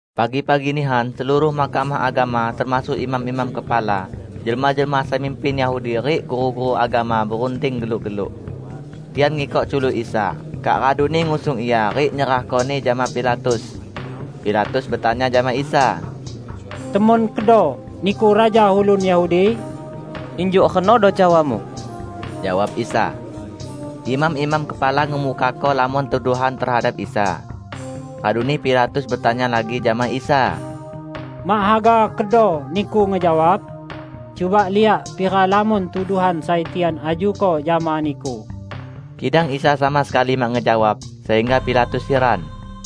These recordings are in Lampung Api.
Pagi-pagi nihan, seluruh Mahkamah Agama termasuk imam-imam kepala, jelma-jelma sai mimpin Yahudi rik guru-guru agama berunding geluk-geluk. Tian ngikok culuk Isa, kak raduni ngusung Ia rik nyerahko-Ni jama Pilatus. Pilatus betanya jama Isa, "Temon kedo Niku raja ulun Yahudi?" "Injuk renodo cawamu," jawab Isa. Imam-imam kepala ngemukako lamon tuduhan tehadap Isa. Raduni Pilatus betanya lagi jama Isa, "Mak haga kedo Niku ngejawab? Cuba liak pira lamon tuduhan sai tian ajuko jama Niku!" Kidang Isa sama sekali mak ngejawab, sehingga Pilatus hiran.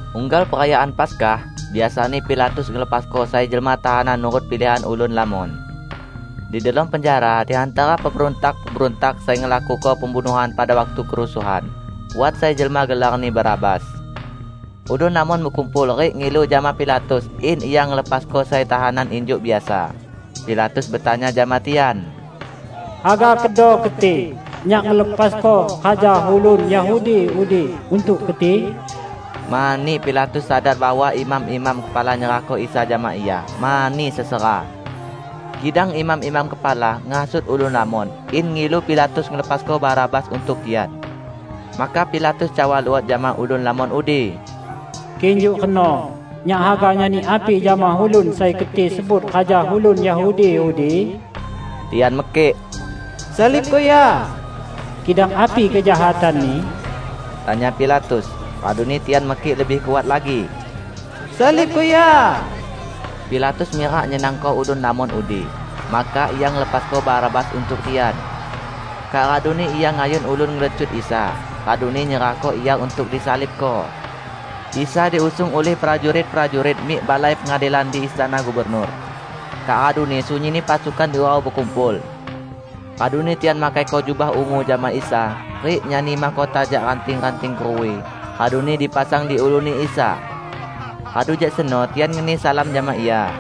Unggal Perayaan Paskah, biasani Pilatus ngelepasko sai jelma tahanan nurut pilihan ulun lamon. Di delom penjara, di hantara pemberuntak-pemberuntak sai ngelakuko pembunuhan pada waktu kerusuhan, wat sai jelma gelarni Barabas. Ulun lamon bekumpul rik ngilu jama Pilatus in ia ngelepasko sai tahanan injuk biasa. Pilatus betanya jama tian, "Haga kedo keti, nyak ngelepasko raja ulun Yahudi udi untuk keti?" Mani Pilatus sadar bahwa imam-imam kepala nyerahko Isa jama ia mani sesera. Kidang imam-imam kepala ngehasut ulun lamon in ngilu Pilatus ngelepasko Barabas untuk tian. Maka Pilatus cawa luot jama ulun lamon udi, "Kik injuk reno, nyak haga nyani api jama ulun sai keti sebut raja ulun Yahudi udi?" Tian mekik, "Salibko Ia!" "Kidang api kejahatan-Ni?" tanya Pilatus. Raduni tian mekik lebih kuat lagi, "Salibko Ia!" Pilatus mirak nyenangko ulun lamon udi, maka ia ngelepasko Barabas untuk tian. Kak raduni ia ngayun ulun ngelecut Isa, raduni nyerahko Ia untuk disalibko. Isa diusung ulih prajurit-prajurit mik balai pengadilan di istana gubernur. Kak raduni sunyinni pasukan diurau bekumpul. Raduni tian makaiko jubah ungu jama Isa, rik nyani mahkota jak ranting-ranting keruwi, raduni dipasang di uluni Isa. Radu jak seno tian ngeni salam jama Ia.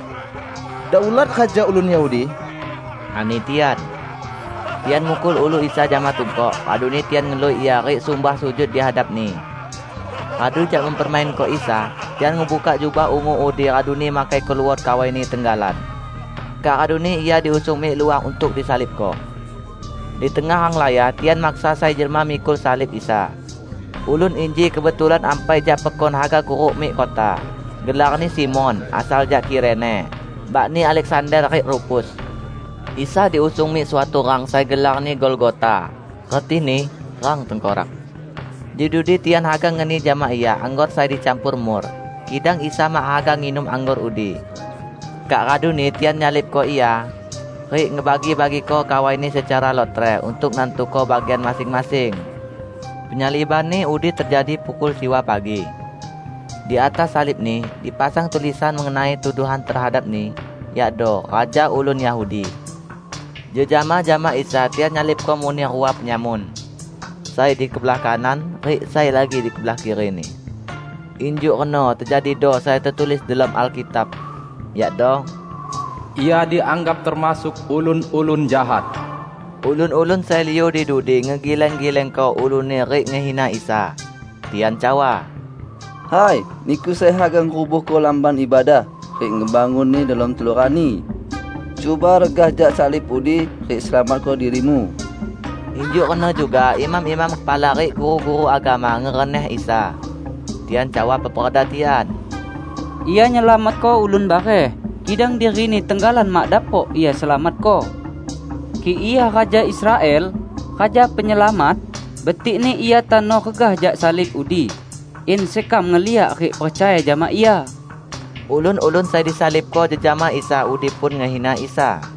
"Daulat Raja ulun Yahudi!" ani tian. Tian mukul ulu Isa jama tungkok, raduni tian ngelui Ia rik sumbah sujud di hadap-Ni. Radu jak mempermainko Isa, tian ngebukak jubah ungu udi raduni makaiko luot kawai-Ni tenggalan. Kak raduni Ia diusung mik luah untuk disalibko. Di tengah renglaya tian maksa sai jelma mikul salib Isa. Ulun inji kebetulan ampai jak pekon haga kuruk mik kota. (Gelarni Simon, -- asal jak Kirene -- bakni Aleksander rik Rufus.) Isa diusung mik suatu rang sai gelarni Golgota, retini "Rang Tengkorak". Di dudi tian haga ngeni jama Ia anggor sai dicampor mur, kidang Isa mak haga nginum anggor udi. Kak raduni tian nyalibko Ia, rik ngebagi-bagiko kawai-Ni secara lotre untuk nantuko bagian masing-masing. Penyaliban-Ni udi tejadi pukul siwa pagi. Di atas salib-Ni dipasang tulisan mengenai tuduhan tehadap-Ni, yakdo: "Raja Ulun Yahudi". Jejama jama Isa tian nyalibko muneh rua penyamun; sai di kebelah kanan rik sai lagi di kebelah kiri-Ni. [ Injuk reno tejadido sai tetulis delom Alkitab; yakdo: "Ia dianggap termasuk ulun-ulun jahat."] Ulun-ulun sai liu di dudi ngegileng-gilengko uluni rik ngehina Isa. Tian cawa, "Hai, Niku sai haga ngerubuhko Lamban Ibadah rik ngebangunni delom telu rani. Cuba regah jak salib udi rik selamatko diri-Mu!" Injuk reno juga imam-imam kepala rik guru-guru agama ngereneh Isa. Tian cawa peperda tian, "Ia nyelamatko ulun bareh, kidang diri-Ni tenggalan mak dapok Ia selamatko! Kik Ia raja Israel, Raja Penyelamat, betikni Ia tano regah jak salib udi, in sekam ngeliak rik percaya jama Ia!" Ulun-ulun sai disalibko jejama Isa udi pun ngehina Isa.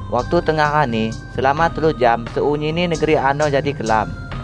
Waktu tengah rani, selama telu jam sunyinni negeri ano jadi kelam.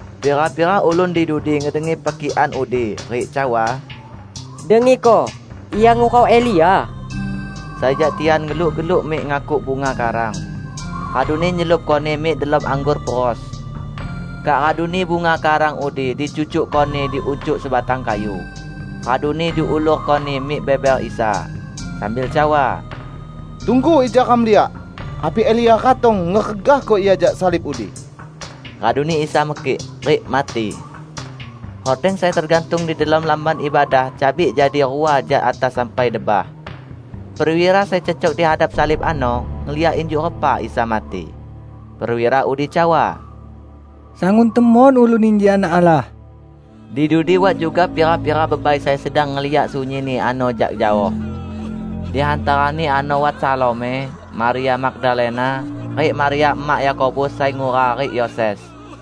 Pira-pira ulun di dudi ngedengi pekikan udi, rik cawa, "Dengiko Ia ngurau Elia!" Sai jak tian geluk-geluk mik ngakuk bunga karang, raduni nyelupkoni mik delom anggor peros. Kak raduni bunga karang udi dicucukkoni di uncuk sebatang kayu, raduni diulurkoni mik beber Isa, sambil cawa, "Tunggu, ija ram liak, api Elia ratong ngeregahko Ia jak salib udi." Raduni Isa mekik, rik mati. Hordeng sai tegantung di delom Lamban Ibadah cabik jadi rua jak atas sampai debah. Perwira sai cecok di hadap salib ano, ngeliak injuk repa Isa mati. Perwira udi cawa, "Sangun temon ulun inji Anak Allah!" Di dudi wat juga pira-pira bebai sai sedang ngeliak sunyinni ano jak jaoh. Di hantarani ano wat Salome, Maria Magdalena, rik Maria emak Yakobus sai ngura rik Yoses.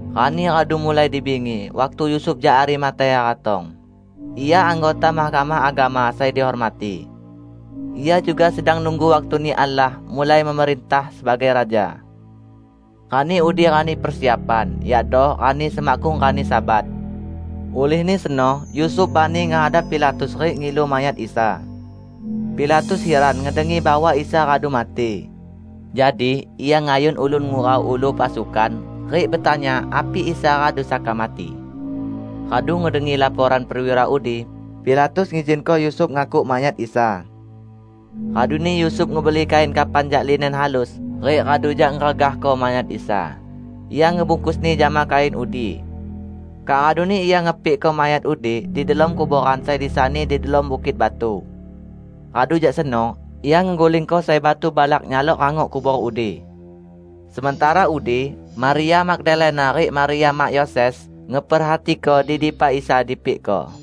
Rani radu mulai di bingi waktu Yusuf jak Arimatea ratong. Ia anggota Mahkamah Agama sai dihormati. Ia juga sedang nunggu waktuni Allah mulai memerintah sebagai Raja. Rani udi rani Persiapan (yakdo rani semakkung rani Sabat.) Ulihni seno Yusuf bani ngehadap Pilatus rik ngilu mayat Isa. Pilatus hiran ngedengi bahwa Isa radu mati. Jadi ia ngayun ulun ngurau ulu pasukan rik betanya api Isa radu saka mati. Radu ngedengi laporan perwira udi, Pilatus ngizinko Yusuf ngakuk mayat Isa. Raduni Yusuf ngebeli kain kafan jak linen halus rik radu jak ngeregahko mayat Isa, ia ngebungkusni jama kain udi. Kak raduni ia ngepikko mayat udi di delom kuboran sai disani di delom bukit batu. Radu jak seno ia ngegulingko sai batu balak nyalok rangok kubor udi. Sementara udi Maria Magdalena rik Maria mak Yoses ngeperhatiko di dipa Isa dipikko.